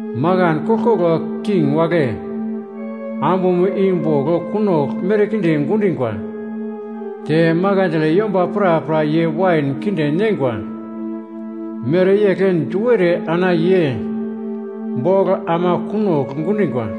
Makan koglkoglo king wagle ambumo i bogl kunogl merkinde gundingwa, te makandle yomba prapra ye wain kinde neingwa mereyegl du ere ana ye bogl ama kunogl gundingwa.”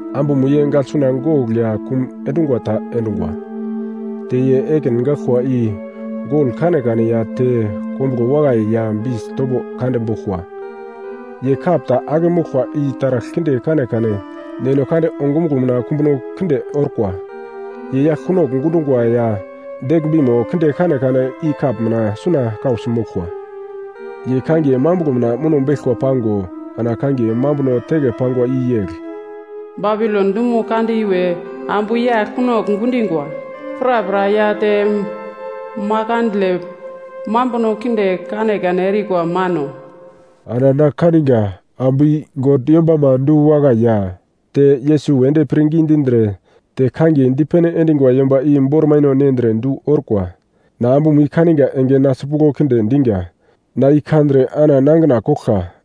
Ambumo ye gaglsuna gogl ya kum endungwa ta endungwa, te ye ekin gaglkwa i gol kanekane ya te kombuglo wakai ya bis topo kande boglkwa. Ye kap ta ake moglkwa i taragl kinde kanekane God ongumuglo mina kumbuno kinde orkwa, ye yagl kunogl gundungwa ya deglmbimo kinde kanekane i kap mina suna kausi moglkwa. Ye kangiye mambuglo mina muno beglkwa pango ana kangiye mambuno teke pangwa i yegl: Babilon dumo kande iwe ambu yagl kunogl gundingwa prapra ya te makandle mambuno kinde kanekane erikwa mano. Ana na kaniga ambu i God yombama du-wakai ya te Yesus wedi pirngi dindre te kangiye dipene endingwa yomba i bormaino nendre du orkwa. Na ambumo i kaniga enge na sipuglo kinde diga. Na i kandre ana nangina koglka.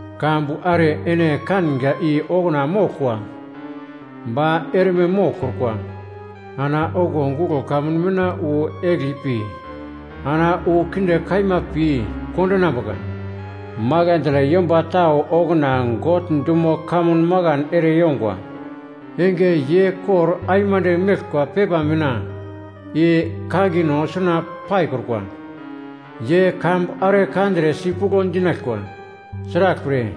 Kambu are ene kanga i okuna moglkwa ba erme moglkrukwa. Ana okuwo guglo kamun mina wu egli pi ana wu kinde kaima pi kondinambuka. Makandle yomba tau okuna God dumo kamun makan ere yongwa enge, ye kor aimande meglkwa pepa mina i kangino suna paikrukwa, ye kambu are kandre sipuglo dinaglkwa. Sraglpre,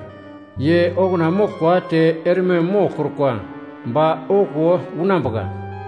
ye okuna moglkwa te erme moglkrukwa ba okuwo unambuka.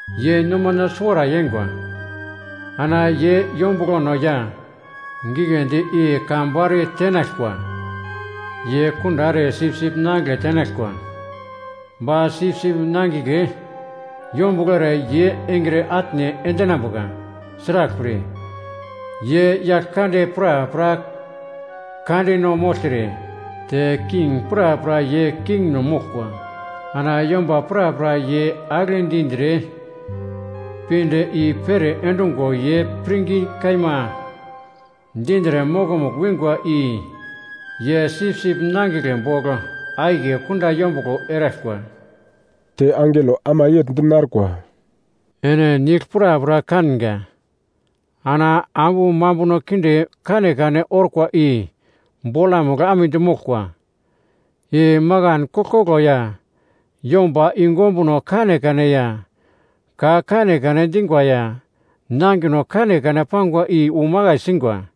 Ye nomano suwara yeingwa. Ana ye yombuglono ya gigledi i kambu are tenaglkwa. Ye kunda ere Sipsip Nangigle tenaglkwa, ba Sipsip Nangigle yombuglo ere ye engre atne endinambuka. Sraglpre, ye yagl kande prapra Kandeno mogltre te king prapra ye Kingno moglkwa. Ana yomba prapra ye agle dindre pinde i-pere endungo ye pirngi kaima dindre mokomugl wingwa i ye Sipsip Nangigle bogl akiye kunda yombuglo eraglkwa.” Te angelo ama yegl di narkwa, “Ene nigl prapra kanga, ana ambu mambuno kinde kanekane orkwa i bolamugl amedi moglkwa. I makan koglkoglo ya yomba yungu ombuno kanekane ya ka kanekane dingwa ya nangino kanekane pangwa i umakai singwa.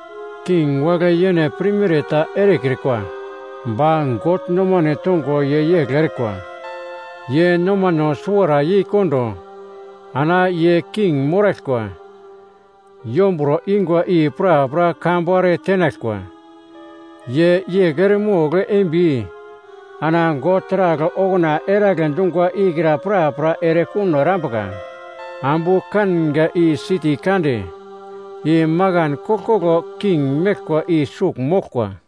King wagle yene pirmere ta erekrikwa ba God nomano tongo ye yegl erikwa. Ye nomano suwara yeikondo ana ye king moraglkwa yomburo ingwa i prapra kambu are tenaglkwa. Ye yegl eremogl eimbi ana God taragl okuna eragle dungwa ikra prapra erekuno erambuka. Ambu kanga i siti kande, i makan koglkoglo king meglkwa i sugl moglkwa.”